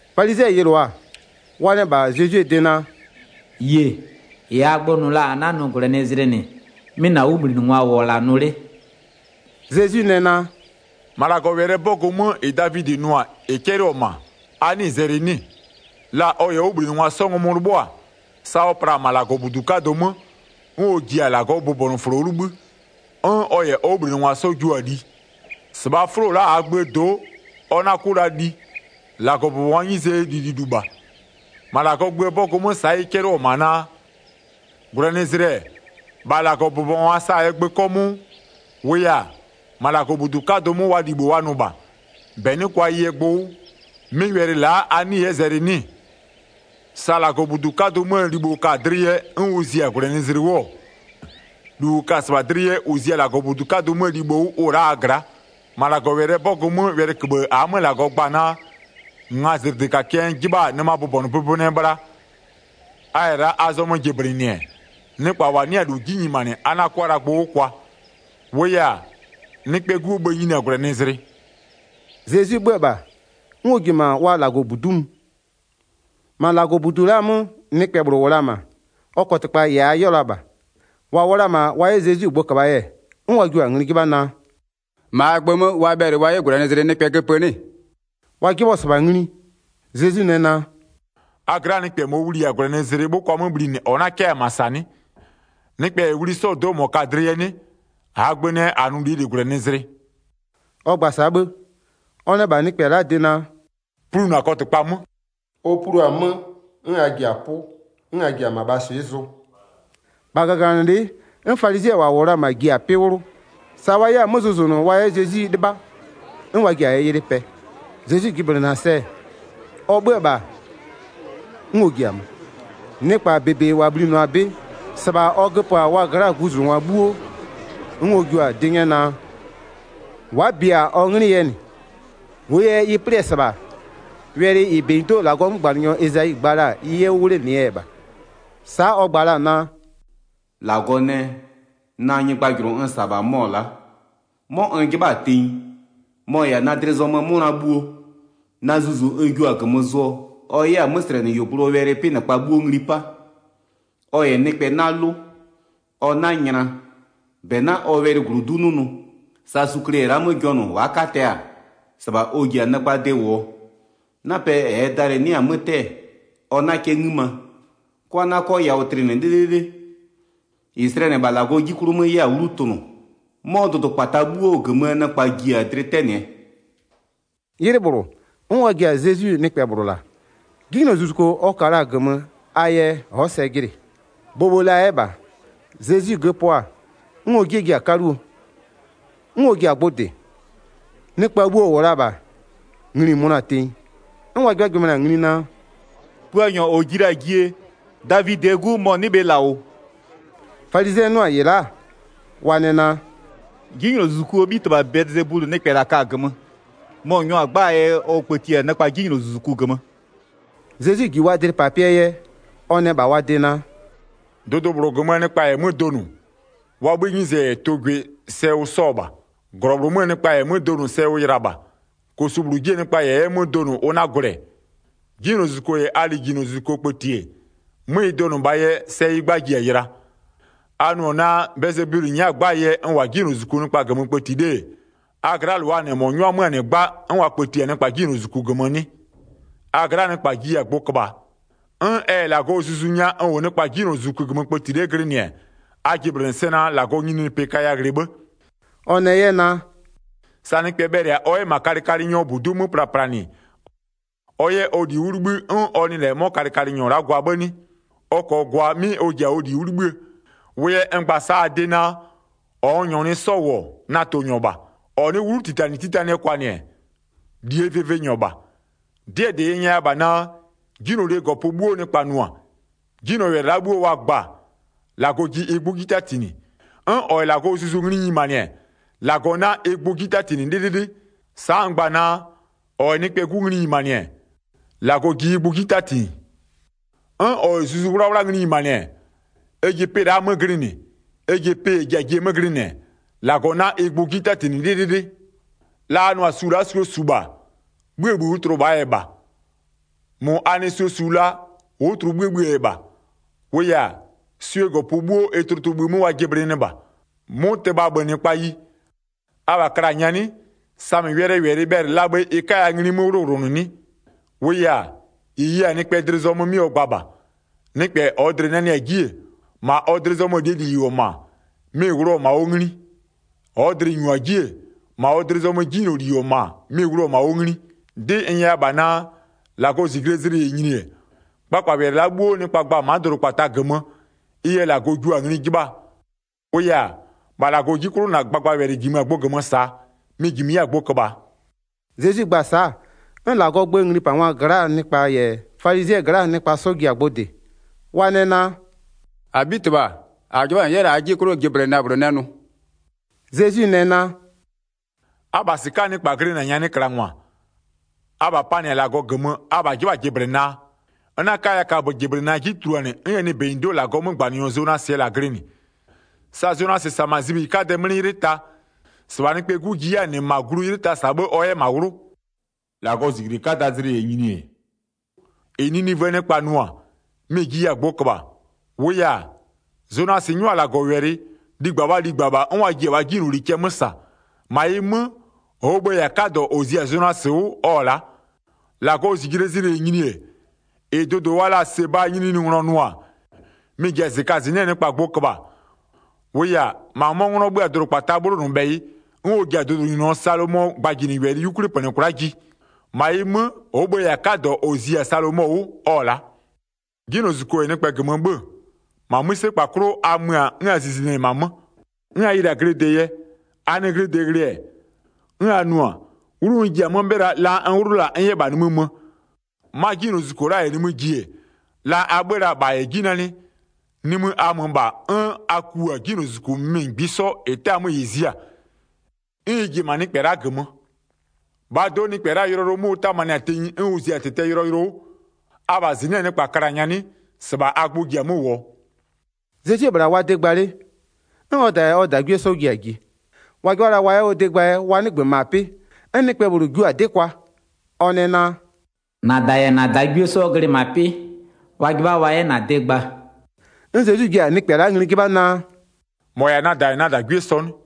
Falizɩɛ yɩlʋa-a, wa nɛ -bha Zezwie de naa: “Yie, -ɩ -aa gbö nʋ la-a -a 'na-a nʋ -gwlɛnɩzlɩ -nɩ, 'mɩ -na 'wʋbhlinɩngwa -wʋ-ɔ -la nʋ 'le.” Zezwi nɛ naa: “-Ma -Lagɔwɛlɩɛ 'bɔgʋ 'mö, -ɩ Davidɩ nʋ-a -ɩ 'cɛlɩɔ-ɔ -ma, a 'nɩɩ-ɩ zɛlɩ 'nɩ-ɩ? La ɔ -yɛ ɔ 'wʋbhlinɩngwa 'sɔ ngɔmʋ 'lɩbhʋa-a, sa ɔ pla-a -ma -Lagɔbudu 'kadʋ 'mö, 'n ɔ ji-a -Lagɔɔ bʋbɔnʋfʋlo 'wʋ 'libhï, 'n ɔ -yɛ ɔ 'wʋbhlinɩngwa 'sɔ jiʋ-a li. -Sɩbhaa 'fʋlo la'a -aa gböö do'o, ɔ 'na 'kʋ la li, -Lagɔbʋbɔngwaa 'nyizee lililu -bha. 5-Ma -Lagɔɔ gböö 'bɔgʋ 'mö sa'a ɩ 'cɛlɩɔ-ɔ -ma naa: -Gwlɛnɩzlɩ-ɛ, -bha -Lagɔbʋbɔngwa sa-a ɛ gbö 'kɔmʋʋ, -wʋʋ yɛ-a, -ma -Lagɔbudu 'kadʋ 'mö wa libho wa nʋ -bha, -bɛ 'nɩ kʋa ɩ yɛ gbʋ 'wʋ, 'mɩ wɛlɩ la'a a 'nɩɩ-ɩ 'yɛ zɛlɩ 'nɩ-ɩ? Sa -Lagɔbudu 'kadʋ 'möö libho ka-a dlɩ yɛ 'n ʋ zia -gwlɛnɩzlɩ 'wʋ-ɔ, -lu -ʋ ka-a -sɩbha dlɩ yɛ -ʋ zia -Lagɔbudu 'kadʋ 'möö libho 'wʋ, ʋ-ʋ la'a a gla'a. 7-Ma -Lagɔwɛlɩɛ 'bɔgʋ 'mö, wɛlɩköbhë -aa 'mö -Lagɔ gba-a naa: Ngazɩdlɩkakɩɛ n 'jɩbha-a nɩmaa bʋbɔnʋbʋbɔnʋɛ bhla, a -yɛ la a zɔmö jɩblɩnɩ-ɛ, nɩkpa -wa 'nɩ-a -lu 'ji nyimanɩ a 'na 'kʋa la gbʋ 'wʋ kwa. 8-Wʋʋ yɛ-a, Nɩkpɛɛ 'Guo bhë-ë nyini-a -gwlɛnɩzlɩ.” Zezwi 'bhö-ö -bha, 'n ɔ ji-e -ma wa -Lagɔbudu'u mö. 10-Ma -Lagɔbudu la'aa 'mö nɩkpɛ -bhlʋ -wʋ la-a -ma, ɔ kɔtɩkpa -yɛ a 'yɛɔ la -bha. -Wa -wʋ la-a -ma wa 'yɛ Zezwi gbʋ köbha-aa yɛ, 'n wa jio-a ngli 'jɩbha naa: “-Ma -aa gbö 'mö wa bhɛlɩ wa 'yɛ -gwlɛnɩzlɩ nɩkpɛ göpö 'nɩ-ɩ?” Wa 'jɩbhɔ-ɔ -sɩbha ngli, Zezwi nɛ naa: “A gla'aa nɩkpɛ -mɔɔ wli -yɛ-a -gwlɛnɩzlɩ 'bhʋkwa 'mö bhlinɩ -ɔ 'na 'kɛ-a -ma -sa 'nɩ? Nɩkpɛ -yɛ wli 'sɔɔ do'o -mɔ ka-a dlɩ yɛ 'nɩ? -Aa gbö nɛ -a nʋ -lie -li -gwlɛnɩzlɩ.” Ɔ gba-a sa'a 'bhë, ɔ nɛ -bha nɩkpɛ la'aa de naa: “Plu -na kɔtɩkpa 'mö.” Ɔ plua-a 'mö 'n a ji-a 'pʋ 'n a ji-a -mabhaa swɩ'ɩ zʋ. 14-Bha -gaganɩlɩ'ɩ, 'n falizɩɛ -wa -wʋ la-a -ma ji-a 'pɩ 'wlʋ. Sa wa 'yɛ-a 'mö zʋzʋnʋ wa 'yɛ Zezwi 'lɩbha, 'n wa ji-a ɩ yɩlɩ pɛ. Zezwi jɩblɩnɩ-a ɩ sɛ-ɛ, ɔ 'bhö-ö -bha, 'n ɔ ji-a mö. Nɩkpa -bebe -wa bhlinɩɔ-a 'bɩ -sɩbha ɔ göpö-a wa gla'aa guzungwa 'bhuo. 'N ɔ jua-a 'dɩ 'nyɛ naa, wa'a bia ɔ 'nglɩ yɛ -nɩ. 17-Wʋʋ yɛ ɩ 'plɩ-ɛ -sɩbha, wɛlɩ -ɩ -benyido'oo -Lagɔɔ 'mögbanɩnyɔ Ezayi gba la-a, ɩ 'yɛ 'wʋ 'wlenɩɛ yɛ -bha. Sa'a ɔ gba la-a naa: “-Lagɔ nɛ: Na nyɩgbajʋlʋ n -sa-a -bha mɔ-ɔ la'a, 'mɔ n 'jɩbha-a tenyi, mɔ-ɔ -yɛ-a na dlɩ zɔmöö 'mʋna bhuo, na Zuzu n jio-a -gömö zʋɔ, ɔ 'yɛ-a 'möslɛnɩyuogblʋɔ wɛlɩ 'pɩnɩkpa 'bhuo ngli 'pa. Ɔ -yɛ nɩkpɛ 'na 'lʋ, ɔ 'na nyla, -bɛ 'na ɔ wɛlɩ -glodu'u 'nʋnʋ. Sa sukle -yɛ la'a 'mö jɔnʋ, wa'a 'katɛ-a, -sɩbha ɔ ji-a nɩkpaa de -wʋ-ɔ. 'Napɛ -ɛɛ dalɩ-ɩ 'nɩ-a 'mö 'tɛ-ɛ, ɔ 'na 'kɛ 'ngïma, 'kwa 'na 'kɔ yawʋ tlɩnɩ 'lɩlɩlɩ, -ɩ slɛnɩ-ɛ -bha -Lagɔ 'ji 'klʋ 'mö 'yɛ-a 'wlu tʋnʋ. 'Mɔ dʋdʋkpata 'bhuo -gömöö nɩkpa ji-a dlɩ 'tɛnɩɛ.” 'Ylɩ -bhlʋ, 'n wa ji-a Zezwi nɩkpɛ -bhlʋ -la. 'Jinylozuzuko ɔ ka la-a -gömö a yɛ ɔ'ɔ sɛ jɩnɩ, bhobho la 'yɛ -bha. Zezwi göpöɔ-a, 'n ɔ 'jie ji-a 'kaluo, 'n ɔ ji-a gbʋ -dɩ. Nɩkpa bhuo -wʋ la-a -bha, ngli-i mönʋa-a tenyi 'n wa 'jɩbhajɩbhanɩ-a ngli naa: “Puanyɔ -ɔ ji la-a jie, Davidɩɛ 'Gu mɔ-ɔ 'nɩ bhe -la -wʋ?” Falizɩɛ 'nʋ-a -ɩ la'a, wa nɛ naa: “'Jinylozuzukuo 'bhitɩbha Bɛlɩzebulɩ nɩkpɛ -la ka-a -gömö, mɔ-ɔ 'nyɔ-a 'gbaa yɛ ɔ kpëti-a nɩkpa 'jinylozuzuku -gömö.” Zezwi -ji wa dlɩpapɩɛ yɛ, ɔ nɛ -bha wa de naa: “Dʋdʋ -bhlʋ -gömöö nɩkpa -yɛ 'mö donʋ, wa 'bhïë 'nyize -yɛ tʋ gwɩ sɛ ʋ 'sɔ-ɔ -bha. -Glɔ -bhlʋ 'möö nɩkpa -yɛ 'mö donʋ sɛ ʋ yɩla -bha. -Kosu -bhlʋ 'jie nɩkpa -yɛ 'yɛ 'mö donʋ, ʋ 'na gwlɛ. 'Jinylozuzuko -yɛ a lijinylozuzuko kpëti-e, 'mö ɩ donʋ -bhaa yɛ, sɛ ɩ 'gba ji-a yɩla. A nʋ-ɔ naa Bɛlɩzebulɩ nyɛ'ɛ-a 'gbaa yɛ n -wʋ-a 'jinylozuzuku nɩkpa -gömö kpëti 'le-e, a gla'aa -lʋaa -nɩ -mɔ nyʋa 'mö-a -nɩ 'gba 'n wa kpëti-a nɩkpa 'jinylozuzuku -gömö 'nɩ? A gla'aa nɩkpa jiya-a gbʋ köbhaa. 'N ɛ -yɛ -Lagɔɔ Zuzu nya n -wʋ nɩkpa 'jinylozuzuku -gömö kpëti 'le glɩnɩ-ɛ, a jɩblɩnɩ sɛ naa -Lagɔɔ nyininyinipɩ kaya ghlɩ 'bhë.” Ɔ nɛ 'yɛ naa: “Sa nɩkpɛ bhɛlɩ-a ɔ 'yɛ -ma kalɩkalɩnyɔɔ -budu'u 'mö plaplanɩ ɔ 'yɛ ɔ -li 'wʋ 'libhï 'n ɔ nɩ -lɛ 'mɔ kalɩkalɩnyɔ la'a gwa 'bhë 'nɩ? Ɔ -kɔɔ gwa 'mɩ ɔ ji-a ɔ -li 'wʋ 'libhïë. Wʋ yɛ n gba-a sa'a a de naa: -Ɔ n -nyɔɔ nɩ 'sɔ -wʋ-ɔ, na tʋnyɔ -bha. -Ɔ nɩ'ɩ 'wlutitanɩtitanɩɛ kwanɩ-ɛ, -lie vɩvɩnyɔ -bha. 'Dɩɛ -dɩ n nyɛya -bha naa: 'Jinylolie -gɔpö 'bhuo nɩkpa nʋ-a, 'jinylɔwɛlɩ la'a 'bhuo wa gba-a, -Lagɔ ji ɩ gbʋ 'ji 'tatinɩ. 'N -ɔ -yɛ -Lagɔɔ Zuzu ngli nyimanɩ-ɛ, -Lagɔ 'na ɩ gbʋ 'ji 'tatinɩ 'lɩlɩlɩ. Sa'a n gba-a naa: -Ɔ -yɛ Nɩkpɛɛ 'Gu ngli nyimanɩ-ɛ, -Lagɔ ji ɩ gbʋ 'ji 'tatinɩ, 'n -ɔ -yɛ Zuzu 'Wlawla ngli nyimanɩ-ɛ, ɛ ji pɩ la'aa 'mö glɩnɩ, ɛ ji pɩ -ɛ ji-a jie 'mö glɩnɩ-ɛ, -Lagɔ 'na ɩ gbʋ 'ji 'tatinɩ 'lɩlɩlɩ. La a nʋ-a su la'a suo -su -bha, 'bhïë -bhï ʋ tlʋ -bhaa yɛ -bha. -Mʋ a nɩ suo -su la, ʋ'ʋ tlʋ 'bhïë bhïë yɛ -bha. -Wʋʋ yɛ-a, swie -gɔpö 'bhuo ɩ tlʋtlʋbhï 'mö wa jɩblɩnɩɩ -bha. 'Mʋtɩmabhönɩkpayi, abha kla-a nyanɩ, samɩ wɛlɩɛ -wɛlɩ bhɛlɩ la bhe ɩ 'kaya ngli 'mö 'wlʋwlʋnʋ 'nɩ? -Wʋʋ -yɛ-a, -ɩ ye-a nɩkpɛ dlɩ 'klʋ 'mɩ ɔ gba -bha. Nɩkpɛ -ɔɔ dlɩ-ɩ nanɩ-a 'ji-e, -ma ɔ dlɩ zɔmöö -lie -li -wʋ-ɔ -ma, mɩ-ɩ wlʋ-ɔ -ma ɔ ngli. -Ɔɔ dlɩ-ɩ -nyua 'ji-e, -ma ɔ dlɩ zɔmöö 'jinyloli -wʋ-ɔ -ma mɩ-ɩ wlʋ-ɔ -ma ɔ ngli. 'Dɩ n nyɛya -bha naa: -Lagɔɔ -zijlee zlɩ -yɛ nyini-e, kpakpawɛlɩ la'a 'bhuo nɩkpa gba-a ma'a dʋdʋkpata -gömö, ɩ yɛ -Lagɔ jua-a ngli 'jɩbhaa. 37-Wʋʋ yɛ-a, -bha -Lagɔɔ 'ji 'klʋ, -na gbagbawɛlɩ -jimö-a gbʋ -gömö -saa, mɩ-ɩ -jimö 'yɛ-a gbʋ köbhaa.” Zezwi gba-a sa'a, 'n -Lagɔɔ gböö nglipangwa gla'aa nɩkpa -yɛ falizɩɛ gla'aa nɩkpa 'sɔ ji-a gbʋ -dɩ, wa nɛ naa: “-Abhitɩbha, -a 'jɩbha -n 'yɛ la'a -aa 'jie 'klʋ jɩblɩna -bhlʋ nɛ nʋnʋ.” Zezwi nɛ naa: “Abha -sɩka'aa nɩkpa glɩnɩ-a nyanɩklangwa, abha panɩ-a -Lagɔ -gömö, abha 'jɩbha-a jɩblɩnaa? N 'na 'kaya kaböjɩblɩna 'ji tuluanɩ 'n ɛ nɩ -benyido'oo -Lagɔɔ 'mögbanɩnyɔ Zonasɩɛ -la glɩnɩ. Sa Zonasɩ -sa-a -ma zibhiyi 'kadɛɛ 'mlɩ 'ylɩ ta, -sɩbha Nɩkpɛɛ 'Gu ji 'yɛ-a -nɩ -ma glu 'ylɩ ta -saa 'bhë ɔ 'yɛ -ma 'wlʋ. 41-Lagɔɔ -zijle 'kadaa zlɩ -yɛ nyini-e, -ɩ Ninivöö nɩkpa nʋ-a, mɩ-ɩ jiya-a gbʋ köbhaa, -wʋʋ yɛ-a, Zonasɩ 'nyʋa-a -Lagɔwɛlɩ, ligba wa ligba -bha 'n wa ji-a wa 'jinyloli cɛ 'mö -sa. -Ma ɩ 'mö, -ɔɔ 'bhë-ë -yɛ-a 'kadɔ -ɔ zi-a Zonasɩ 'wʋ ɔ-ɔ la'a. 42-Lagɔɔ -zijlee zlɩ -yɛ nyini-e, -ɩ dʋdʋ wa la-a Sebaa nyininyininglɔ nʋ-a, mɩ-ɩ ji-a -zɩkazɩnɩ'ɩɛ nɩkpa gbʋ köbhaa. -Wʋʋ yɛ-a, -ma 'mɔ 'nglɔ 'bhö-a dʋdʋkpataa 'bhlonʋbhɛyɩ 'n ɔ ji-a dʋdʋnyininyɔ Salomɔɔ gbajinɩwɛlɩ 'yukwli -pönɩ kwla'a ji. -Ma ɩ 'mö, -ɔɔ bhë-ë -yɛ-a 'kadɔ -ɔ zi-a Salomɔ 'wʋ, ɔ-ɔ la'a. 'Jinylozuzuko -yɛ nɩkpɛ -gömö 'bhö-ö, -ma 'mïsekpa 'klʋ a mö-a 'n a zizinɩ-ɛ -ma 'mö, 'n a yɩlɩ-a glɩde yɛ, a nɩ glɩde ghlɩ-ɛ, 'n a nʋ-a, 'wlu n ji-a 'mö 'bhɩla, la n 'wlʋ la-a n 'yɛ -bha nimï mö. 'Ma 'jinylozuzuko -yɛ nimï ji-e, la a 'bhö-ö la-a -bha -yɛ 'ji nanɩ, nimï a mö -bha 'n a ku-a 'jinylozuzuku -mɩmɩ -ngbisɔ -ɩ 'tɛ-a 'mö -ɩ zia-a. 'N ɩ ji-e -ma nɩkpɛ la'a -gömö. -Bhaa do'o, 'mɔ nɩkpɛ la'aa yʋlɔyʋlʋ 'mö ʋ 'tamanɩ-a tenyi 'n ʋ zi-a -tɩtɛɛ yʋlɔyʋlʋ 'wʋ. Abha -zɩnɩ'ɩɛ nɩkpa kla-a nyanɩ, -sɩbha a gbʋ ji-a 'mö -wʋɔ.” Zezwie -bhla wa de gba 'le, 'n ɔ -da -yɛ ɔ -dagwie 'sɔ ji-a ji. Wa 'jɩbha la wa 'yɛ ɔ de gbaa yɛ wa 'nɩgbö -ma 'pɩ. 'N nɩkpɛ -bhlʋ jio-a 'dɩ kwa, ɔ nɛ naa: “-Na -da -yɛ -na -dagwie 'sɔ glɩ -ma 'pɩ, wa 'jɩbha wa 'yɛ -na de gba.” 'N Zezwi ji-a nɩkpɛ la'a ngli 'jɩbha naa: “-Mɔ -yɛ-a na -da -yɛ na -dagwie sɔ 'nɩ?”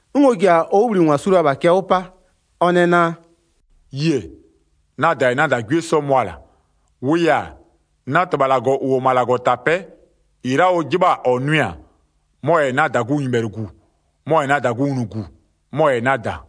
'N ɔ ji-a ɔ 'wʋbhlinɩngwa su la-a -bha cɛ 'wʋ 'pa. Ɔ nɛ naa: “Yie, na -da -yɛ na -dagwie 'sɔ mʋa-a -la. 50-Wʋʋ yɛ-a, na -Tɩbha -Lagɔ -ʋ -wʋ-ɔ ma -Lagɔtapɛ'ɛ, -ɩ la'a ʋ 'jɩbha-a -ɔ nʋɩ-a, mɔ-ɔ -yɛ-a na -dagunyɩbhɛlʋgu, mɔ-ɔ -yɛ-a na -dagunglugu, mɔ-ɔ -yɛ-a na -da.”